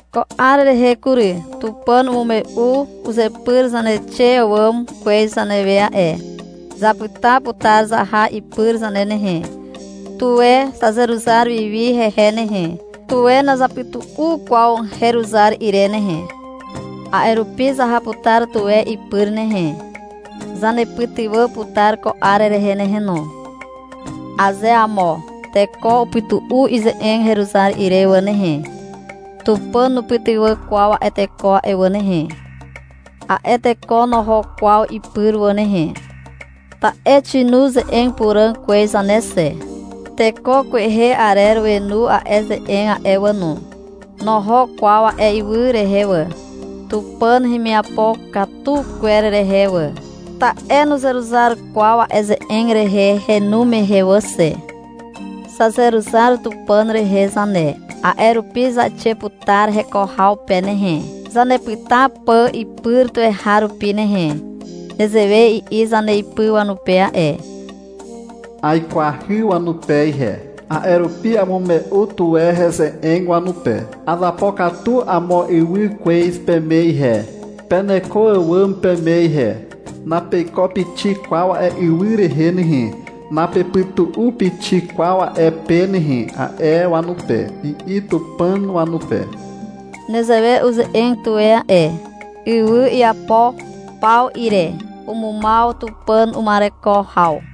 Ko 'ar rehe kury, Tupàn umume'u uzepyr zaneixe àwàm kwez zanewe a'e. Zapyta putar zaha ipyr zane nehe. Tuwe zazeruzar wi wi hehe nehe. Tuwe nazapytu'u kwaw heruzar ire nehe. A'e rupi zaha putar tuwe ipyr nehe. Zanepytywà putar ko 'ar rehe nehe no. Aze amo teko upytu'u ize'eg heruzar ire wà nehe, Tupàn nupytywà kwaw a'e teko a'e wà nehe. A'e teko noho kwaw ipyr wà nehe. Ta'e xinu ze'eg puràg kwez zane xe. Teko kwehe arer wenu a'e ze'eg a'e wà no. Noho kwaw a'e ywy rehe wà, Tupàn hemiapo katu kwer rehe wà. Ta'e nuzeruzar kwaw a'e ze'eg rehe henu mehe wà xe. Zazeruzar Tupàn rehe zane. A'e rupi zaixe putar heko haw pe nehe, zanepyta pà ipyr tuweharupi nehe. Nezewe i'i zaneipy wanupe a'e. — Aikwahy wanupe ihe. A'e rupi amume'u tuwe heze'eg wanupe. — Azapokatu amo ywy kwez peme ihe, peneko àwàm peme ihe. Napeiko pixik kwaw a'e ywy rehe nehe. Napepytu'u pixik kwaw a'e pe nehe, a'e wanupe, i'i Tupàn wanupe. Nezewe uze'eg tuwe a'e. Ywy iapo paw ire umumaw Tupàn uma'ereko haw.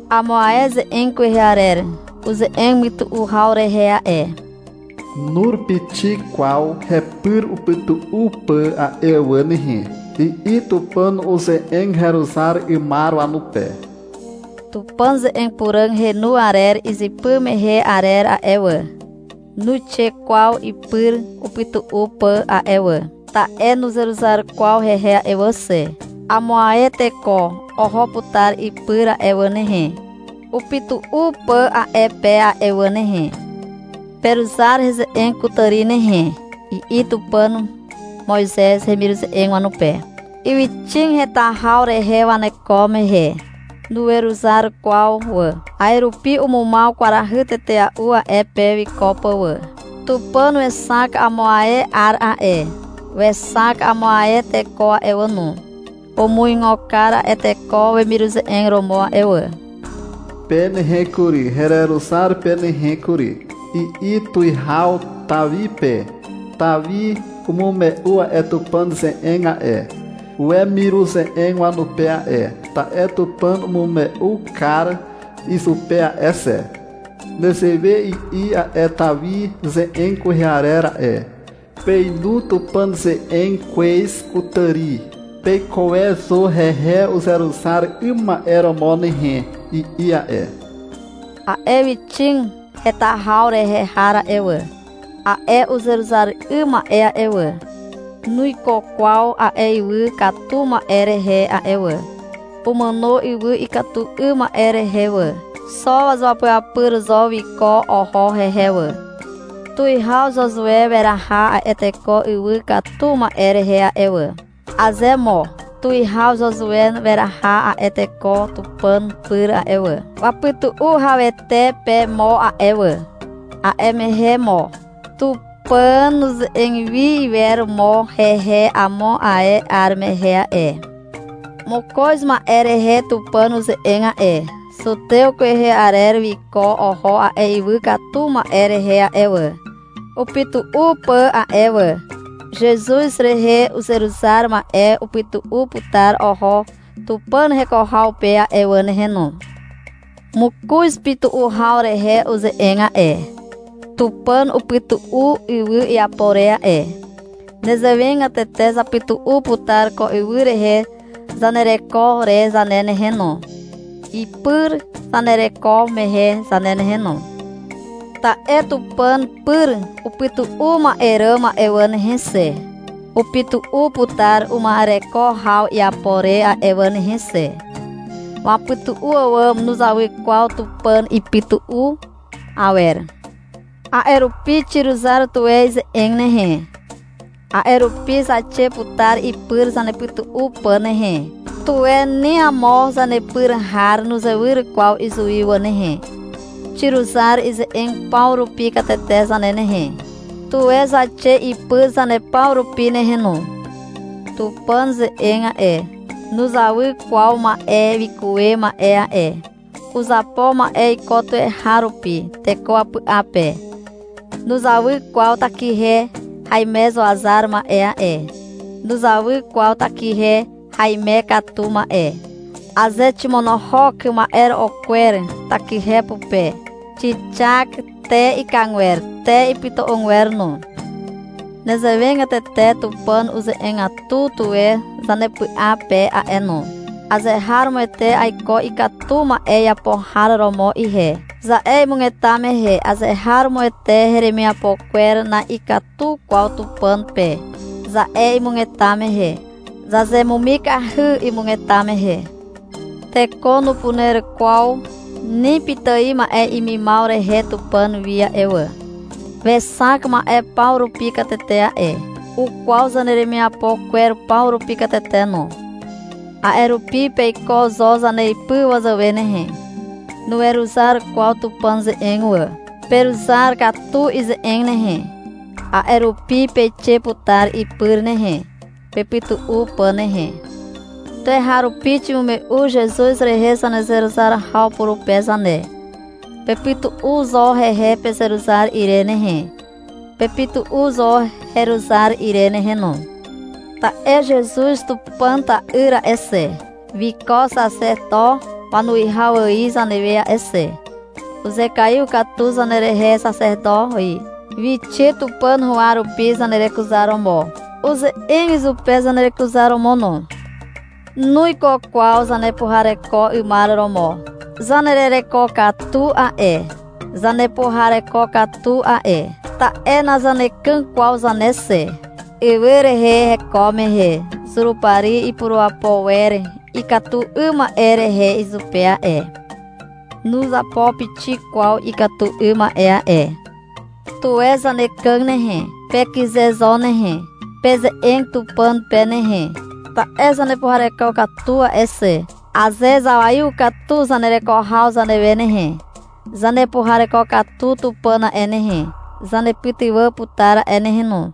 Amo ae ze'eg kwehe arer uze'eg mytu'u haw rehe a'e. — Nur pixik kwaw hepyr upytu'u pà a'e wà nehe, i'i Tupàn uze'eg heruzar 'ymar wanupe. Tupàn ze'eg puràg henu arer izypy mehe arer a'e wà, nuixe kwaw ipyr upytu'u pà a'e wà, ta'e nuzeruzar kwaw hehe a'e wà xe. Amo ae teko oho putar ipyr a'e wà nehe, upytu'u pà a'e pe a'e wà nehe. — Peruzar heze'eg kutàri nehe, i'i Tupàn Moizez hemiruze'eg wanupe, ywyxig heta haw rehe waneko mehe. Nuweruzar kwaw wà. A'e rupi umumaw kwarahy tetea'u a'e pe wiko pà wà. Tupàn wexak amo ae 'ar a'e. Wexak amo ae teko a'e wà no. Umuigo kar a'e teko wemiruze'eg romo a'e wà. — Pe nehe kury, hereruzar pe nehe kury, i'i tuwihaw Tawi pe. Tawi umume'u a'e Tupàn ze'eg a'e, wemiruze'eg wanupe a'e, ta'e Tupàn umume'u kar izupe a'e xe. Nezewe i'i a'e Tawi ze'eg kwehe arer a'e. — Peinu Tupàn ze'eg kwez kutàri. Peikuwe zo hehe uzeruzar 'ym ma'e romo nehe, i'i a'e. A'e ywyxig heta haw rehe har a'e wà, a'e uzeruzar 'ym ma'e a'e wà, nuiko kwaw a'e ywy katu ma'e rehe a'e wà. Umàno ywy ikatu 'ym ma'e rehe wà. Xo wazuapyapyr zo wiko oho hehe wà. Tuwihaw Zuzue weraha a'e teko ywy katu ma'e rehe a'e wà. Aze mo tuwihaw Zuzue weraha a'e teko Tupàn pyr a'e wà, wapytu'u hawete pe mo a'e wà, a'e mehe mo Tupàn nuze'eg wi iwer mo hehe amo ae 'ar mehe a'e. Mokoz ma'e rehe Tupàn uze'eg a'e. Zutew kwehe arer wiko oho a'e ywy katu ma'e rehe a'e wà, upytu'u pà a'e wà. Zezuz rehe uzeruzar ma'e upytu'u putar oho Tupàn heko haw pe a'e wà nehe no. Mokoz pytu'u haw rehe uze'eg a'e. Tupàn upytu'u ywy iapo re a'e. Nezewegatete zapytu'u putar ko ywy rehe zanereko re zane nehe no, ipyr zanereko mehe zane nehe no. Ta'e Tupàn pyr upytu'u ma'e ràm a'e wà nehe xe, upytu'u putar uma'ereko haw iapo re a'e wà nehe xe. Wapytu'u àwàm nuzawy kwaw Tupàn ipytu'u awer. A'e rupi xiruzar tuwe ize'eg nehe. A'e rupi zaixe putar ipyr zapytu'u pà nehe. Tuwe ni amo zanepyr har nuzewyr kwaw izuwi wà nehe. Xiruzar ize'eg paw rupi katete zane nehe. Tuwe zaixe ipyr zane paw rupi nehe no. Tupàn ze'eg a'e, nuzawy kwaw ma'e wikuwe ma'e a'e. Uzapo ma'e iko tuweharupi teko wapy'a pe. Nuzawy kwaw takihe haimezuazar ma'e a'e. Nuzawy kwaw takihe haime katu ma'e. Aze ximonohok ma'ero'o kwer takihe pupe, xixak te ikagwer, te iputu'ugwer no. Nezewegatete Tupàn ze'eg uze'egatu tuwe zanepy'a pe a'e no. — Azeharomoete aiko ikatu 'ym ma'e iapo har romo ihe, za'e imugeta mehe. — Azeharomoete heremiapo kwer na'ikatu kwaw Tupàn pe, za'e imugeta mehe. Zazemumikahy imugeta mehe. Teko nupuner kwaw ni pitài ma'e imimaw rehe Tupàn wi a'e wà. Wexak ma'e paw rupi katete a'e. Ukwaw zaneremiapo kwer paw rupi katete no. A'e rupi peiko zo zaneipy wazàwe nehe. Nuweruzar kwaw Tupàn ze'eg wà. Peruzar katu ize'eg nehe. A'e rupi peixe putar ipyr nehe, pepytu'u pà nehe. Tuweharupi ximume'u Zezuz rehe zanezeruzar haw purupe zane. Pepytu'u zo hehe pezeruzar ire nehe. Pepytu'u zo heruzar ire nehe no. Ta'e Zezuz Tupàn ta'yr a'e xe, wiko Xaxeto wanuwihaw ài zanewe a'e xe. Uzekaiw katu zanerehe, xaxeto ài. Wixe Tupàn huwa rupi, zanerekuzaromo. Uze'eg izupe zanerekuzaromo no. Nuiko kwaw zanepuhareko 'ymar romo. Zanerereko katu a'e. Zanepuhareko katu a'e, ta'e nazanekàg kwaw zane xe. Ywy rehe heko mehe Zurupari ipurapo wer ikatu 'ym ma'e rehe izupe a'e. Nuzapo pixik kwaw ikatu 'ym ma'e a'e. Tuwe zanekàg nehe. Pekyze zo nehe. Peze'eg Tupàn pe nehe, ta'e zanepuhareko katu a'e xe. Aze zawaiw katu zanereko haw zanewe nehe, zanepuhareko katu Tupàn a'e nehe, zanepytywà putar a'e nehe no.